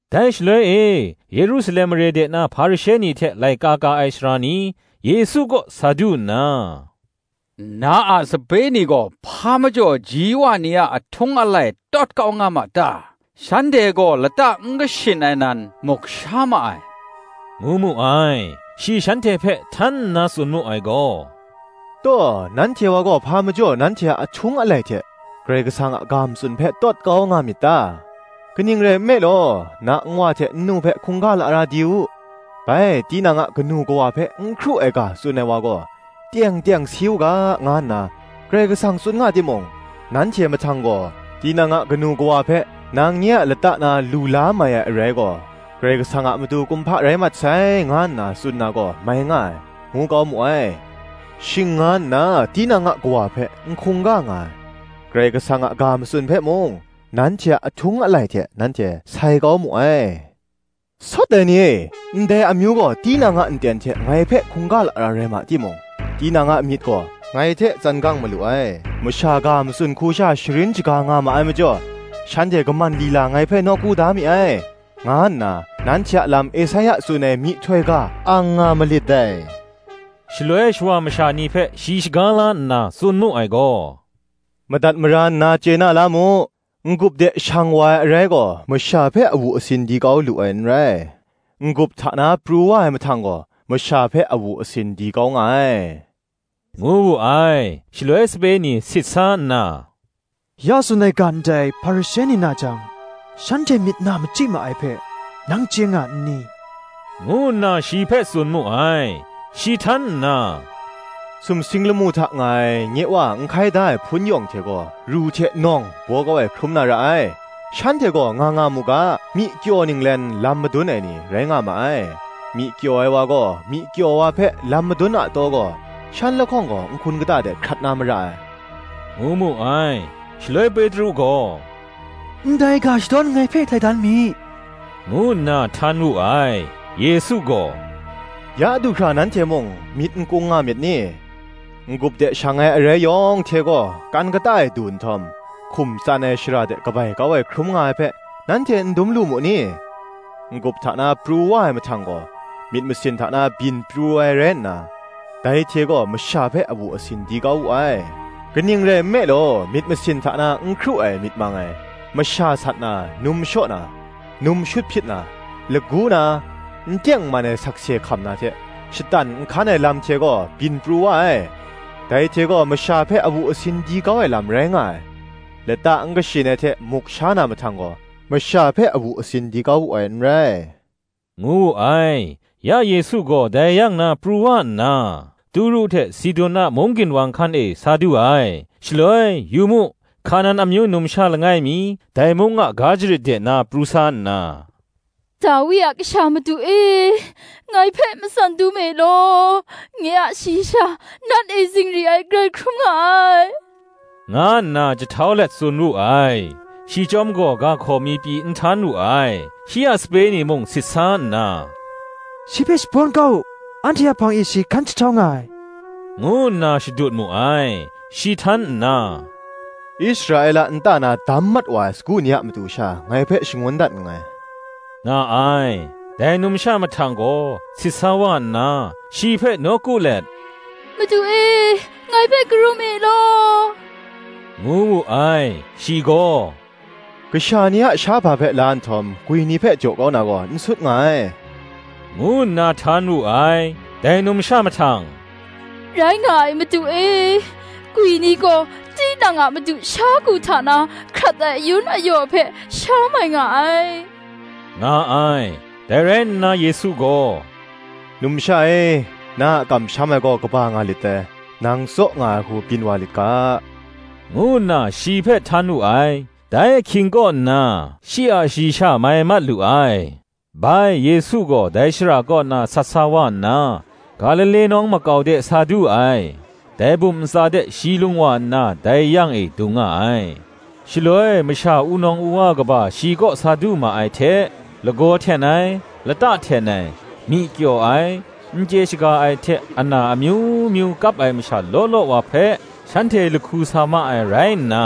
Dai shaloi e, Yerusalem mare de na Hparishe ni hte laika ka ai sara ni, Yesu kaw sa du nna, “Na a sape ni gaw hpa majaw ji wa ni a ahtung alai tawt kau nga ma ta? shanhte gaw lata n kashin ai nan, muk sha ma ai,” ngu mu ai. Shi shanhte hpe htan nna tsun mu ai gaw, “Taw, nanhte wa gaw, hpa majaw nanhte a ahtung alai hte, Karai Kasang a ga matsun hpe tawt kau nga myit ta? Kaning rai nme law, ‘Na nwa hte nnu hpe hkungga lara di u; bai Tinang a kanu kawa hpe n hkru ai ga tsun ai wa gaw, teng teng si u ga,’ nga nna Karai Kasang tsun nga timung, nanhte mahtang gaw, ‘Tinang a kanu kawa hpe, Nang nye a lata na lu la mai ai arai gaw, Karai Kasang a matu kumhpa rai mat sai, nga nna tsun na gaw mai nga ai,’ ngu kau mu ai: shing nga nna, tinang a kawa hpe n hkungga nga ai; Karai Kasang a ga matsun hpe mung, nanhte a ahtung alai hte nanhte sai kau mu ai. Sawt ai ni e, “Ndai amyu gaw, tinang a nten hte ngai hpe hkungga lara rai ma timung, Tinang a myit gaw, ngai hte tsan gang malu ai. Masha ga matsun hku sha sharin shaga nga ma ai majaw, Shanhte kaman lila ngai hpe nawku da mi ai,” nga nna, nanhte a lam Esaia tsun ai myihtoi ga ang nga malit dai. Shaloi shawa masha ni hpe shi shaga la nna tsun mu ai gaw, “Madat mara nna chye na la mu: n-gup de shang wa ai arai gaw, masha hpe awu asin di kau lu ai n rai; n-gup hta na pru wa ai mahtang gaw, masha hpe awu asin di kau nga ai,” ngu wu ai. Shaloi sape ni sit sa nna, “Ya tsun ai ga ndai Hparishe ni na jang, shanhte myit na machyi ma ai hpe nang chye nga n ni?” ngu nna shi hpe tsun mu ai. Shi htan nna, “Sumsing lamu hta nga ai nye Wa n hkai da ai hpun yawng hte gaw, ru hte nawng baw kau ai hkrum na ra ai. Shanhte gaw nga nga mu ga: myi kyaw ninglen lam madun ai ni rai nga ma ai: myi kyaw ai wa gaw, myi kyaw wa hpe lam madun a taw gaw, shan lahkawng gaw nhkun kata de hkrat na mara ai,” ngu mu ai. Shaloi Petru gaw, “Ndai ga shadawn anhte hpe htai dan mi,” ngu nna htan wu ai. Yesu gaw, “Ya du hkra nanhte mung, myit n kung nga myit ni? N-gup de shang ai arai yawng hte gaw, kan kata e du nhtawm, hkum tsan ai shara de kabai kau ai hkrum nga ai hpe, nanhte n dum lu mu ni? N-gup hta na pru wa ai mahtang gaw, myit masin hta na byin pru ai rai nna, dai hte gaw masha hpe awu asin di kau wu ai. Kaning rai nme law, myit masin hta na n hkru ai myit mang ai, masha sat na, num shaw na, num shut hpyit na, lagu na, n teng n man ai sakse hkam na hte shatan nhkan ai lam hte gaw byin pru wa ai. Dai hte gaw masha hpe awu asin di kau ai lam rai nga ai; lata n kashin ai hte muk sha na mahtang gaw, masha hpe awu asin di kau wu ai n rai,” ngu wu ai. Ya Yesu gaw dai yang na pru wa nna, Turu hte Sidun a mung ginwang hkan e sa du ai. Shaloi, Yu mu, Hkanan amyu numsha langai mi, dai mung a ga jarit de na pru sa nna, “Dawi a Kasha, Madu e, ngai hpe matsan dum e law; nye a shayi sha nat e zingri ai grai hkrum nga ai,” nga nna jahtau let tsun wu ai. Shi chyawm gaw ga hkaw mi pyi n htan wu ai. Shi a sape ni mung sit sa nna, “Shi hpe shabawn kau u; anhte a hpang e shi hkan jahtau nga ai,” ngu nna shadut mu ai. Shi htan nna, “Israela nta na dam mat wa ai sagu ni a matu sha, ngai hpe shangun dat nngai,” nga ai. Dai numsha mahtang gaw, sit sa wa nna, shi hpe nawku let, “Madu e, ngai hpe karum e law,” ngu wu ai. Shi gaw, “kasha ni a shahpa hpe la nhtawm, gwi ni hpe jaw kau na gaw, n sut nga ai,” ngu nna htan wu ai; Dai numsha mahtang, “Rai nga ai, Madu e; gwi ni gaw tinang a madu a sha ku hta na hkrat ai ayun ayaw hpe sha mai nga ai,” nga ai. Dai rai nna Yesu gaw, “Numsha e; na a kamsham ai gaw kaba nga lit dai; nang tsaw nga ai hku byin wa lit ga,” ngu nna, shi hpe htan wu ai. Dai ahkying kaw nna, shi a shayi sha mai mat lu ai. Bai Yesu gaw dai shara kaw na sat sa wa nna, Galile nawng makau de sa du ai: dai bum ntsa de shi lung wa nna, dai yang e dung nga ai. Shaloi masha wunawng wuwa kaba shi kaw sa du ma ai hte, lagaw hten ai, lata hten ai, myi kyaw ai, n chye shaga ai hte ana amyu myu kap ai masha law law wa hpe, shanhte lahku sa ma ai rai nna,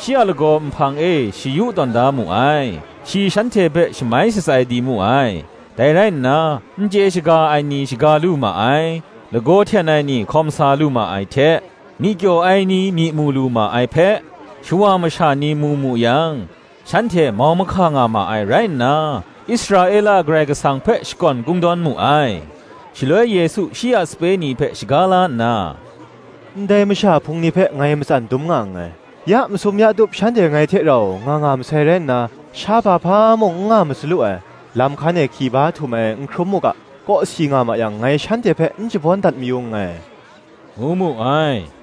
shi a lagaw nhpang e shayu tawn da mu ai: shi shanhte hpe shamai shatsai di mu ai. Dai rai nna, n chye shaga ai ni shaga lu ma ai, lagaw hten ai ni hkawm sa lu ma ai hte, myi kyaw ai ni myi mu lu ma ai hpe, shawa masha ni mu mu yang, shanhte mau mahka nga ma ai rai nna, Israela Karai Kasang hpe shakawn kungdawn mu ai. Shaloi Yesu shi a sape ni hpe shaga la nna, “Ndai masha hpung ni hpe ngai matsan dum nga nngai: ya masum ya tup shanhte ngai hte rau nga nga masai rai nna, shahpa hpa mung n nga masalu ai: lam hkan e hki ba htum ai n hkrum mu ga, kawsi nga ma yang ngai shanhte hpe n shabawn dat mayu nngai,” ngu mu ai.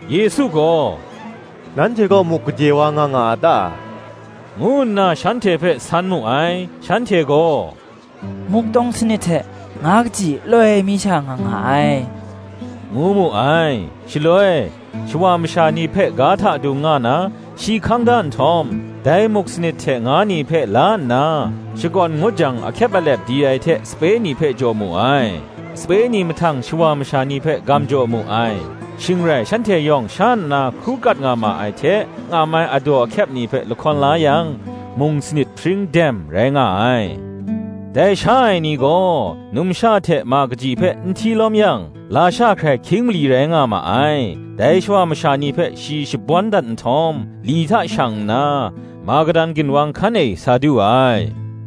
Yesu gaw, “Nanhte kaw muk gade wa nga nga a ta? ngu nna shanhte hpe san mu ai. Shanhte gaw, Muk tawng sanit hte nga kaji loi mi sha nga nga ai,” ngu mu ai. Shaloi shawa masha ni hpe ga hta dung nga na, shi hkang da nhtawm, dai muk sanit hte nga ni hpe la nna, shakawn ngut jang ahkyep alep di ai hte sape ni hpe jaw mu ai; sape ni mahtang shawa masha ni hpe gam jaw mu ai. Shing rai shanhte yawng sha nna hkru kat nga ma ai hte ngam ai adaw ahkyep ni hpe lahkawn la yang, mung sanit hpring dem rai nga ai. Dai sha ai ni gaw, numsha hte ma kaji hpe n hti lawm yang, lasha hkrai hkying mali rai nga ma ai. Dai shawa masha ni hpe shi shabawn dat nhtawm, li hta shang nna, Magadan ginwang hkan e sa du ai.